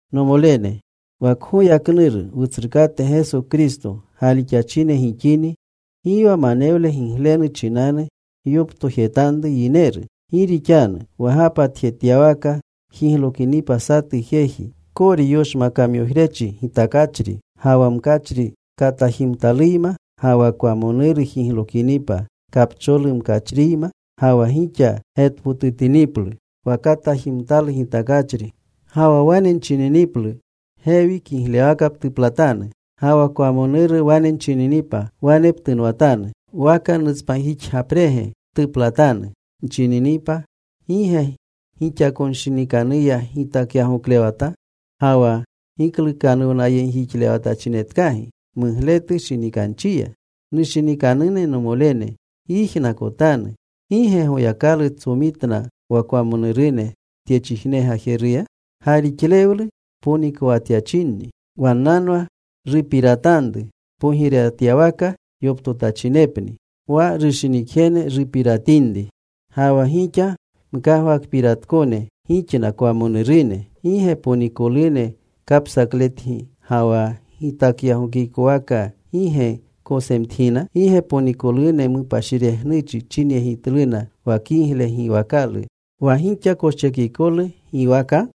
Nomolene, wa kgoyaknuru Wutsrukate Geso Kristo galixachine gixini, gi wa manewle giglenu chinanu gyoptojetanru yineru. Gi rixanu wa gapatjetyawaka jiglokinipa satu jeji, kori yoshmakamyojrechi gitakachri ga wa mkachri katajimtaluyma, ga wa kwamonuru jiglokinipa kapcholu mkachriyma, ga wa gixa getpotutiniplu wa katajimtalu gitakachri, ga wa wane nchininiplu, “Gewi kiglewaka ptuplatanu.” Ga wa kwamonuru wane nchininipa, “Wane ptunwatanu.” Waka, “Nutspanjixgapre ptuplatanu,” nchininipa, ¿gi ge gixakonshinikanuya gitakyagoklewata, ga wa giklukanuwnayegjixlewatachinetkagi mugletu shinikanchiya? Nushinikanune nomolene, gyijnakotanu. ¿Gi ge Goyakalu tsomitna wa kwamonurune tyechijne gajeruya, galixlewlu ponikowatyachinni? Wannanwa rupiratanru pogirewatawaka yoptotachinepni, wa rushinikjene rupiratinri. Ga wa gixa mkagwakpiratkone gixna kwamonurune. ¿Gi ge ponikolune kapsakletgi, ga wa gitakyagookikowaakaka gi gekosemtgina? ¿Gi ge ponikolune mupashiregnuchi chinyegitluna wa kigle giwakalu wa gixa koschekikolu giwaka?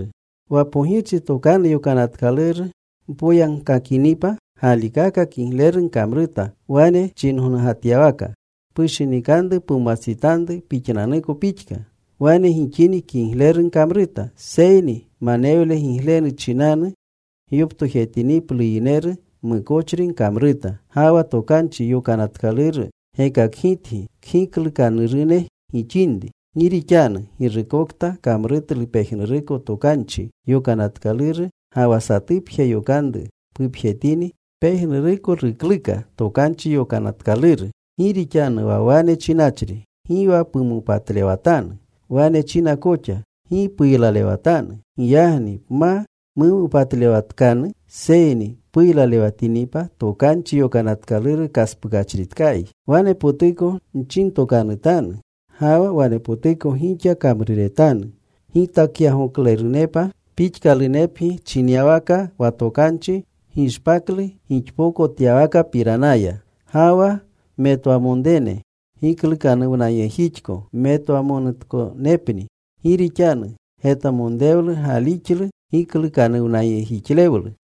Wa pogirchi tokanu yokanatkaluru mpoyagkakinipa galikaka kigleru gkamruta wane chinyongatyawaka, “Pushinikanru pumwastsitanru pixnanuko pixka.” Wane gixini, kigleru gkamruta. Seyni manewle giglenu chinanu gyoptojetiniplu yineru, mukochri gkamruta. Ga wa Tokanchi Yokanatkaluru gekakgitgi kgiklukanurune gixinri. Gi rixanu girukokta kamrutlu pejnuruko Tokanchi Yokanatkaluru, ga wa satupje yokanru pupjetini, pejnuruko rukluka Tokanchi Yokanatkaluru. Gi rixanu wa wane chinachri: Gi wa pumopatlewatanu, wane china koxa: Gi puylalewatanu. Giyagni pma mumopatlewatkanu seyni puylalewatinipa, Tokanchi Yokanatkaluru kaspukachritkayi. Wanepotuko nchintokanutanu ga wa wanepotuko gixa kamruretanu gitakyagookalunepa pixkalunepgi chinyawaka wa tokanchi gishpaklu gixpokotyawkapiranaya. Ga wa metwamonrene giklukanuwnayegjixko metwamonutkonepni. Gi rixanu getwamonrewlu gaalixlu giklukanuwnayegjixlewlu.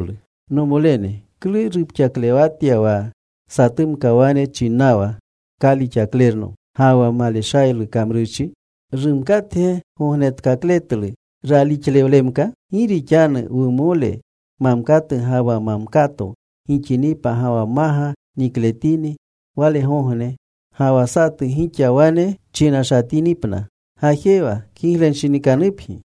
Nomolene, ¿klu rupxaklewatya wa satumka wane chinnawa, “Kalixaklerno,” ga wa maleshaylu kamrurchi? ¿Rumkatge gognetkakletlu ralixlewlemka? Gi rixanu wumole mamkatu ga wa mamkato gixinipa ga wa maga nikletini walegogne, ga wa satu gixa wane chinashatinipna, “Gajewa. Kiglenshinikanupgi.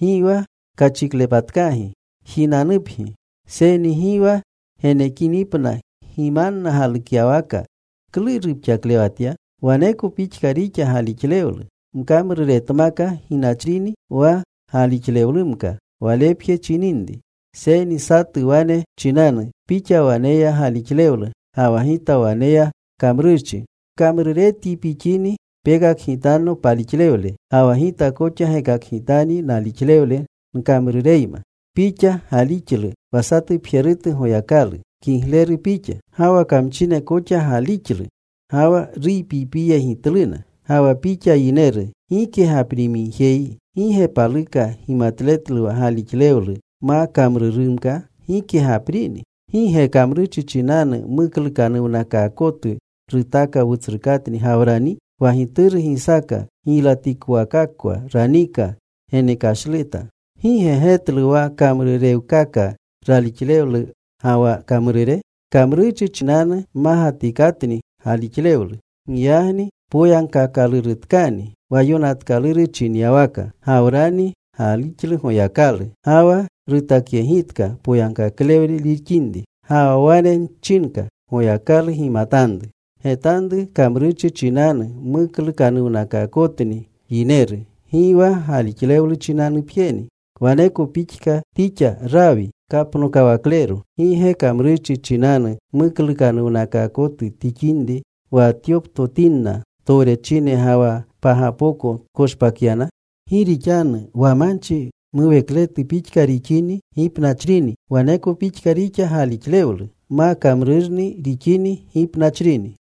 Gi wa kachiklepatkagi. Jinanupgi.” Seyni gi wa genekinipna gimanna galukyawaka, ¿klu rupxaklewatya? Waneko pixka rixa galixlewlu. Mkamruretmaka gipnachrini wa galixlewlumka walepje chininri. Seyni satu wane chinanu, “Pixa waneya galixlewlu. Ga wa gita waneya kamrurchi.” Mkamruretyi pixini pekakgitanno palixlewle, ga wa gita koxa gekakgitanyi nalixlewle nkamrureyma. Pixa galixlu wa satupjerutu Goyakalu. Kigleru pixa. Ga wa kamchine koxa galixlu ga wa ruypiypiyegitluna. Ga wa pixa yineru gike gaprimigjeyi, ¿gi ge paluka gimatletlu wa galixlewlu ma kamrurnumka gike gaprini? ¿Gi ge kamrurchi chinanu muklukanuwnakaakotu rutaaka wutsrukatni Gawrani? Wa gituru Gisaaka giylatikowakakwa ranika genekashleta. ¿Gi ge getlu wa rukamrurewkaka ralixlewle ga wa kamrure? Kamrurchi chinanu mmagatikatni galixlewlu. Giyagni poyagkaakalurutkani wa yonatkaluru chinyawaka: Gawrani galixlu Goyakalu. Ga wa rutakyegitka poyagkaklewle rixinri. Ga wa wane chinka Goyakalu gimatanru. Getanru. Kamrurchi chinanu muklukanuwnakaakotni yineru. Gi wa galixlewlu chinanupjeni. Waneko pixka tixa Raawi kapnokawaklero. ¿Gi ge kamrurchi chinanu muklukanuwnakaakoto tixinri, wa tyoptotinna towrechine ga wa pagapoko tkoshpakyana? Gi rixanu wa manchi muwekletu pixka rixini gipnachrini, waneko pixka rixa galixlewlu. Ma kamrurnu rixini, gipnachrini.